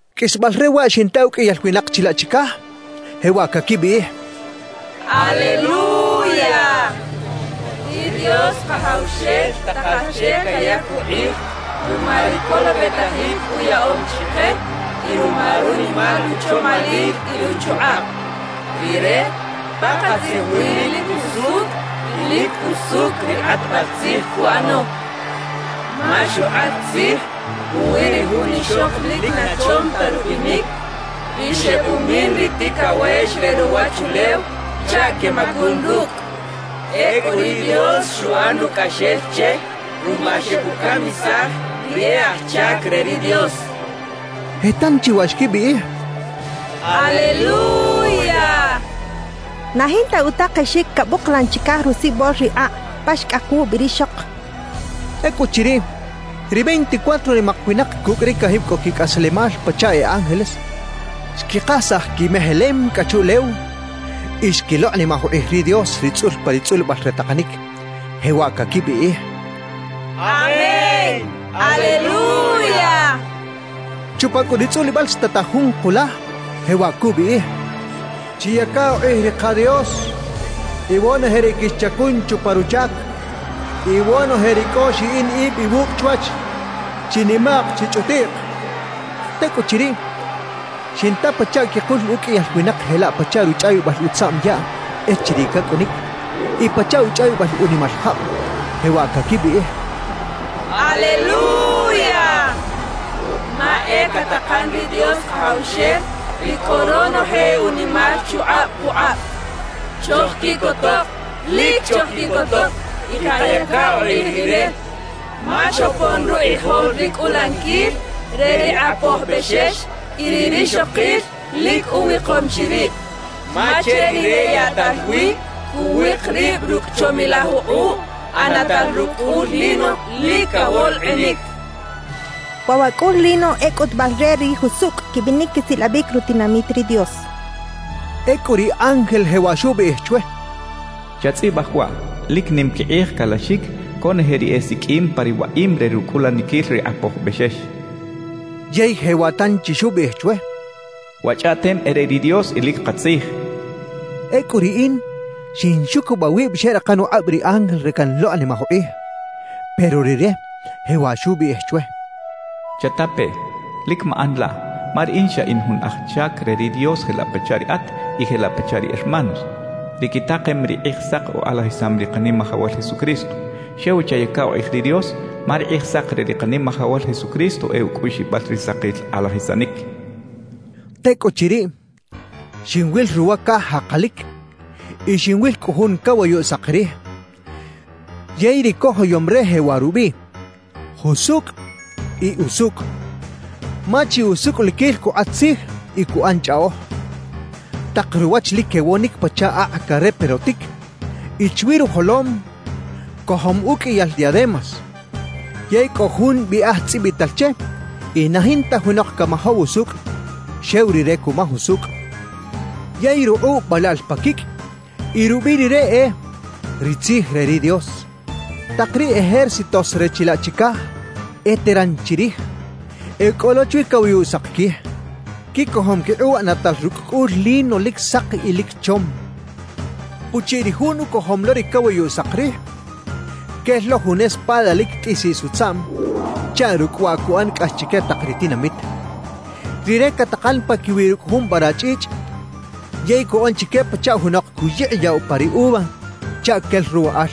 Qꞌuisbal re waꞌ xinta uqꞌuiyal winak chilaꞌ chicaj jewaꞌ caquibiꞌij: «¡Aleluya! ¡Ri Dios Kajawxel takal che cayac ukꞌij ruma ri colobetajic uyaꞌom chike y ruma runimal uchomalil y ruchukꞌab! Rire pakatzij wi lic usucꞌ y lic jusucꞌ ri kꞌatbal tzij cuꞌano. Ma xukꞌat tzij puwi ri jun ixok lic na chom ta rubinic, ri xebumin ri ticawex re ruwachulew chaꞌ quemacun rucꞌ. Ecꞌu ri Dios xuꞌan ucꞌaxel che ruma xebucamisaj ri e aj chac re ri Dios» quechaꞌ. Je tanchi waꞌ xquibiꞌij: «¡Aleluya! Na jinta utakexic cabuklan chicaj rusibol ri akꞌ pa xcꞌak wubi rixok» xechaꞌ. Ecꞌuchiriꞌ, ri veinticuatro nimak winak cucꞌ ri cajib cꞌo quicꞌaslemal pachaꞌ e ángeles, xquikasaj quimejelem cꞌa chuꞌlew y xquilokꞌnimaj ukꞌij ri Dios ri tzꞌul pa ri tzꞌulibal re takanic, jewaꞌ caquibiꞌij: «¡Amén! ¡Aleluya!» quechaꞌ. Chupa cꞌu ri tzꞌulibal xtataj jun kulaj, jewaꞌ cubiꞌij: «Chiyaca ukꞌij ri ka Dios, iwonoje ri quixchacun chupa ruchac, iwonoje ri cꞌo xiꞌin ib iwucꞌ chwach, chinimaꞌk chichꞌutiꞌk» cachaꞌ. Tecꞌuchiriꞌ, xinta pachaꞌ quikul uqꞌuiyal winak jelaꞌ pachaꞌ ruchꞌawibal utzaꞌm yaꞌ echiriꞌ cacꞌunic y pachaꞌ uchꞌawibal unimal jab, jewaꞌ caquibiꞌij: «¡Aleluya! Ma e catakan ri Dios Kajawxel, ri cꞌo ronoje unimal chukꞌab pukꞌab. Chojquiꞌcotok, lic chojquiꞌcotok y kayaca ukꞌij Rire, ma xopon rukꞌijol ri cꞌulaniquil re ri Kꞌapoj Bexex y ri rixokil lic uwikom chi rib. Ma che rire yaꞌtal wi cuwik rib rucꞌ chomilaj ukꞌuꞌ ꞌanatal rucꞌ cꞌul lino lic cawolkꞌinic» quechaꞌ. Waꞌ wa cꞌul lino e cꞌutubal re ri jusucꞌ quibinic quisilabic rutinamit ri Dios. Ecꞌu ri ángel jewaꞌ xubiꞌij chwe: «Chatzꞌibaj waꞌ: Lic nim quikꞌij calaxic conoje ri esiqꞌuim pa ri waꞌim re rucꞌulaniquil ri Kꞌapoj Bexex» xchaꞌ. Yey jewaꞌ tanchi xubiꞌij chwe: «Wa chꞌaꞌtem e re ri Dios y lic katzij» xchaꞌ. Ecꞌu riꞌin xinxucubaꞌ wib xeꞌrakan ukꞌab ri ángel re canlokꞌnimaj ukꞌij. Pero rire jewaꞌ xubiꞌij chwe: «Chata peꞌ, lic maꞌan laꞌ, ma riꞌin xa in jun aj chac re ri Dios jelaꞌ pachaꞌ riꞌat y jelaꞌ pachaꞌ ri hermanos, ri quitakem ri Kꞌijsak ukꞌalajisam ri Kanimajawal Jesucristo. Xew chayaca ukꞌij ri Dios, ma ri Kꞌijsak re ri Kanimajawal Jesucristo e ucꞌuꞌxibal ri sakil kꞌalajisanic» xcha chwe. Tecꞌuchiriꞌ, xinwil ruwa caj jakalic y xinwil cꞌu jun cawayuꞌ sak rij. Yey ri cojoyom re jewaꞌ rubiꞌ: “Jusucꞌ y Usucꞌ”, ma chi usucꞌliquil cukꞌat tzij y cuꞌan chꞌaꞌoj. Tak ruwach lic quewonic pachaꞌ akꞌ careprotic y chwi rujolom cojom uqꞌuiyal diademas; yey cꞌo jun biꞌaj tzꞌibital che y na jinta junok camajaw usucꞌ, xew Rire cumaj usucꞌ. Yey rukꞌuꞌ balaꞌl pa quicꞌ y rubiꞌ Rire e: “Ri Tzij re ri Dios.” Tak ri ejércitos re chilaꞌ chicaj eteran chirij, e cꞌo lo chwi cawayuꞌ sak quij. Quicojom quikꞌuꞌ ꞌanatal rucꞌ cꞌul lino lic sak y lic chom. Puchiꞌ ri Jun ucojom lo ri cawayuꞌ sak rij, quel lo jun espada lic tꞌisiꞌs utzaꞌm chaꞌ rucꞌ waꞌ cuꞌan cꞌax chique tak ri tinamit. Rire catakan paquiwiꞌ rucꞌ jun vara chꞌichꞌ yey cuꞌan chique pachaꞌ junok cuyikꞌiyaꞌ upa ri uva chaꞌ quel ruwaꞌal.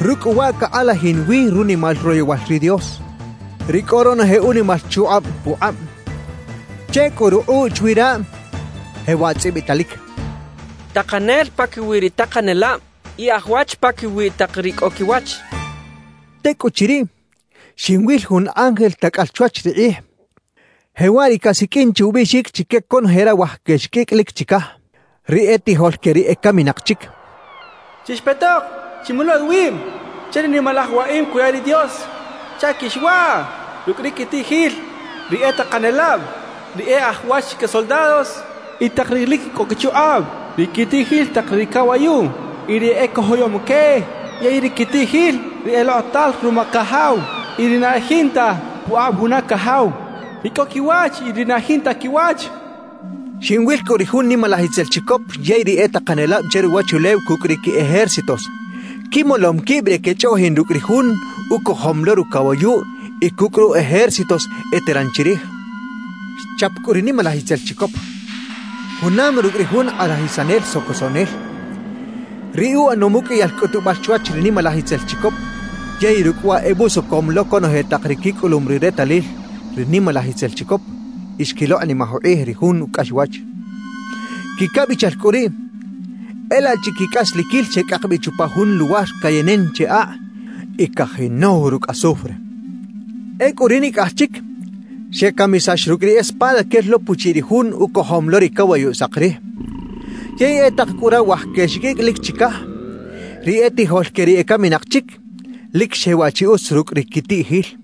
Rucꞌ cꞌu waꞌ cakꞌalajin wi runimal royowal ri Dios, ri cꞌo ronoje unimal chukꞌab pukꞌab. Che cꞌu rukꞌuꞌ chwi raꞌ jewaꞌ tzꞌibitalic: «TAKANEL PAQUIWI RI TAKANELAB Y AJ WACH PAQUIWI TAK RI CꞌO QUIWACH.» Tecꞌuchiriꞌ, xinwil jun ángel tacꞌal chwach ri kꞌij, jewaꞌ ri casiqꞌuin che ubiꞌxic chique conoje rawaj quexiqꞌuicꞌ lic chicaj, ri etijol que ri ecaminak chic: «Chixpetok, chimolo iwib che ri nimalaj waꞌim cuya ri Dios chaꞌ quixwaꞌ rucꞌ ri quitiꞌjil ri e takanelab, ri e aj wach que soldados y tak ri lic cꞌo quichukꞌab; ri quitiꞌjil tak ri cawayuꞌ y ri ecojoyom que; yey ri quitiꞌjil ri elokꞌotal ruma cajaw y ri na e jinta pukꞌab juna cajaw, ri cꞌo quiwach y ri na jinta quiwach» cachaꞌ. Xinwil cꞌu ri jun nimalaj itzel chicop yey ri e takanelab che ruwachulew cucꞌ ri qui ejércitos, quimolom quib re quechꞌoꞌjin rucꞌ ri Jun ucojom lo rucawayuꞌ y cucꞌ ru ejércitos eteran chirij. Xchap cꞌu ri nimalaj itzel chicop, junam rucꞌ ri jun kꞌalajisanel socosoꞌnel, ri uꞌanom uqꞌuiyal cꞌutubal chwach ri nimalaj itzel chicop yey rucꞌ waꞌ ebusocom lo conoje tak ri quicꞌulum ri retalil ri nimalaj itzel chicop y xquilokꞌnimaj ukꞌij ri jun ucꞌaxwach. Quicabichal cꞌu riꞌ, e laꞌ chiquicꞌasliquil xecꞌak bi chupa jun luwar cayenen che akꞌ y cajinow rucꞌ azufre. Ecꞌu ri nicꞌaj chic xecamisax rucꞌ ri espada quel lo puchiꞌ ri Jun ucojom lo ri cawayuꞌ sak rij; yey e tak cꞌu rawaj quexiqꞌuicꞌ lic chicaj, ri etijol que ri ecaminak chic, lic xewaꞌ chi utz rucꞌ ri quitiꞌjil.